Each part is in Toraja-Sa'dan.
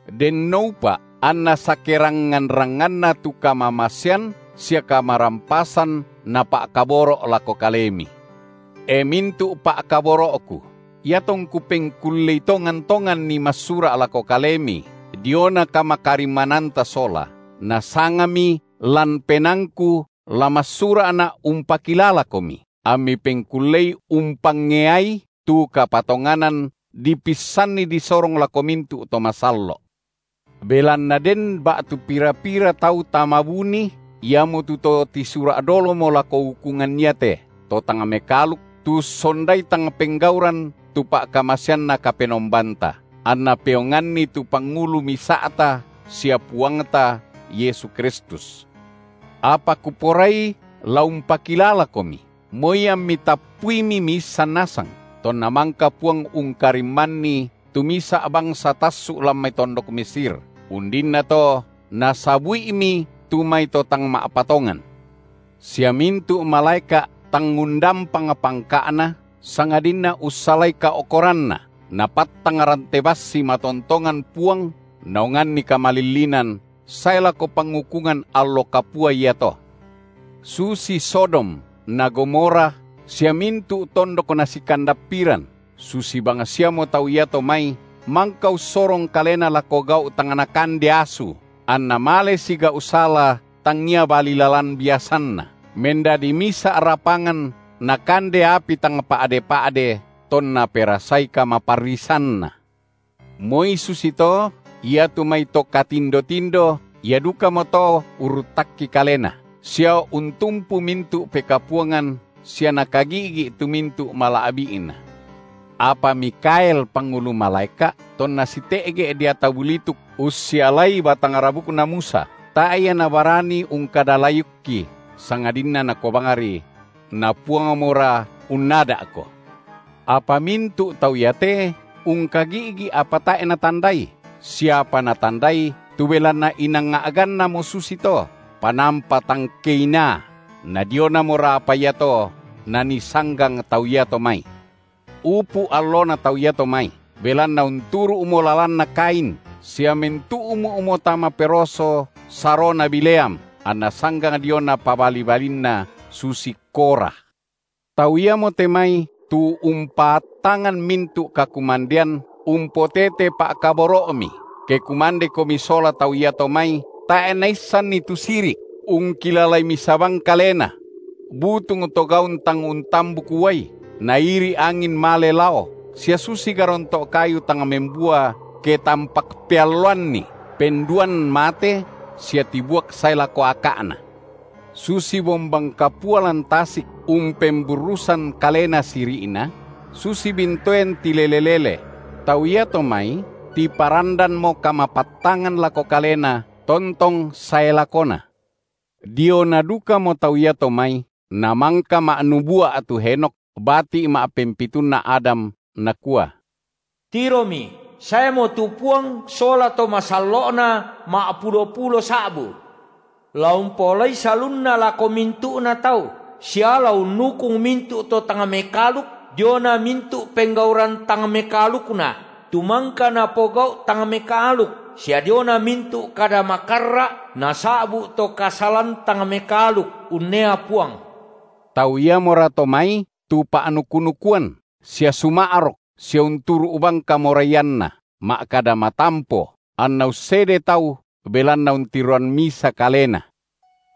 Dennoupa’ anna sakerangngan-rangnganna tu kamamasean sia kamarampasan na pa’kaboro’ lako kalemi. E mintu’ pa’kaboro’ku, iatongku pengkullei tongan-tonganni massura’ lako kalemi diona kamakarimmananta sola, nasangami lan penaangku la massura’na’ umpakilalakomi, ammi pengkullei umpangeai tu kapatonganan dipissanni disorong lako mintu’ to masallo’. Belanna den ba’tu pira-pira tau tama buni, iamotu to tisura’ dolomo lako ukungan iate; to tang mekaaluk, tu ussondai tang penggauran tu pa’kamaseanNa Kapenombanta, anna peonganni tu pangulu misa’ta sia Puangta, Yesu Kristus. Apa kuporai la umpakilalakomi, moi ammi tappuimi miissan nasang, tonna mangka Puang ungkarimmanni tu misa’ bangsa tassu’ lan mai tondok Mesir, undinnato Nasabu’imi tu mai to tang ma’patongan. Sia mintu’ malaeka’ tang undampang pangka’na, sangadinna ussalai kao’koranna, Napattang rante bassi matontongan Puang naonganni kamalillinan sae lako pangukungan allo kapua iato. Susi Sodom na Gomora sia mintu’ tondok nasikandappiran, susi bangsiamo tau iato mai mangka ussorong kalena lako gau’ tang nakande asu anna male sigau’ sala tangia bali lalan biasanna, mendadi misa’ rapangan nakande api tang pa’de-pa’de tonna perasai kamaparrisanna. Moi susito iatu mai to katindo-tindo ia dukamoto urruttakki kalena, sia untumpu mintu’ pekapuangan sia nakagi’gi’ tu mintu’ mala’bi’na. Apa Mikhael pangulu malaeka’, tonna site’ge’ deata bulituk ussialai batang rabukna Musa, tae’ ia nabarani ungkada layukki, sangadinna nakua bangri: Na Puangmora unnada’ko. Apa mintu’ tau iate ungkagi’gi’ apa tae’ natandai, sia apa natandai tu belanna inang a’gannamo susito panampa tang keinaa, na dionamora apa iato nanii sanggang tau iato mai. Upu’ allona tau iato mai, belanna unturu’mo lalanna Kain, sia mentu’mu’mo tama peroso sarona Bileam, anna sanggang diona pabali-balinna susi Korah. Tau iamote mai tu umpaattangan mintu’ kakumandean umpotete pa’kaboro’mi, ke kumandekomi sola tau iato mai tae’ naissanni tu siri’, ungkilalai misa bang kalena; butung to gaun tang untambuk uai, nairi’ angin male lao, sia susi garonto’ kayu tang membua ke tampak pealloanni, penduan mate sia tibuak sae lako aka’na; susi bombang kapua lan tasik umpemburrusan kalena siri’na; susi bintoen tilele-lele; tau iato mai tiparandanmo kamapattangan lako kalena tontong sae lakona. Diona dukamo tau iato mai namangka ma’nubua’ tu Henokh, bati’ ma’pempitunna Adam, nakua: Tiromi, saemo tu Puang sola to masallo’Na ma’pulo-pulo sa’bu, la umpaolai salunna lako mintu’na tau, sia la unnukung mintu’ to tang mekaaluk diona mintu’ penggauran tang mekaalukna, tu mangka napogau’ tang mekaaluk, sia diona mintu’ kada makarra’ nasa’bu’ to kasalan tang mekaaluk unnea Puang. Tau iamorato mai tu pa’nuku-nukuan sia suma’rok sia unturu’ bang kamoraianna, ma’kada matampo, anna ussede tau belanna untiroan misa kalena.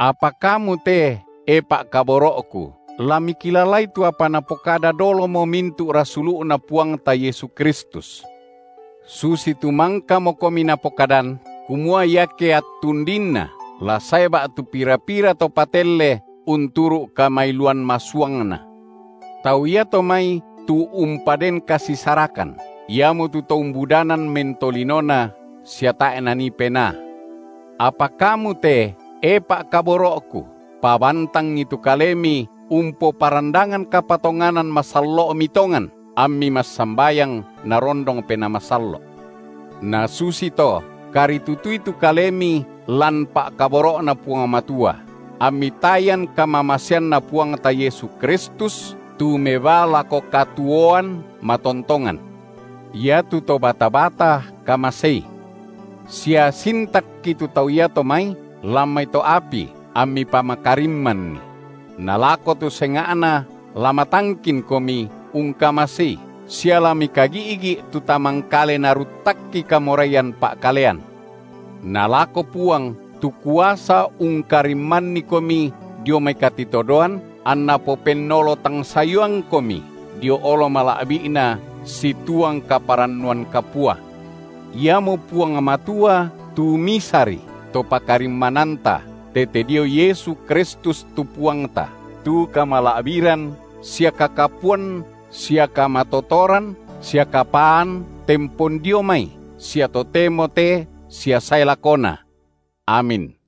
Apa kamu te, e pa’kaboro’ku, la mikilalai tu apa napokada dolomo mintu’ rasulu’Na Puangta Yesu Kristus; susitu mangkamokomi napokadan, kumua iake attu undinna la sae ba’tu pira-pira to patelle tu unturu’ kamailuan masuangna. Tau iato mai tu umpaden kasisarakan, iamotu to umbudanan mentolinona sia tae’ Nanii Penaa. Apa kamu te, e pa’kaboro’ku, pabantangi tu kalemi umpoparandangan kapatonganan masallo’mi tongan, ammi massambayang Narondong Penaa Masallo’. Nasusito karitutui tu kalemi lan pa’kaboro’Na Puang Matua, ammi tayan kamamaseanNa Puangta Yesu Kristus tu mebaa lako katuoan matontongan. Iatu to bata-bata kamasei; sia sintakki tu tau iato mai lan mai to’ api ammi pamakarimmanni; na lako tu senga’na la matangkinkomi ungkamasei, sia la mikagi’gi’ tu tamangkale naruttakki kamoraian pa’kalean. Na lako Puang, tu kuasa ungkarimmannikomi dio mai katitodoan, anNa popennolo tang sayuangkomi dio olo mala’bi’Na, situang kaparannuan kapua, iamo Puang Matua tu Misari, To pakarimmananta, tete dio Yesu Kristus tu Puangta, tu kamala’biran sia kakapuan sia kamatotoran sia kapaan tempon dio mai sia totemo te sia sae lakona. Amin.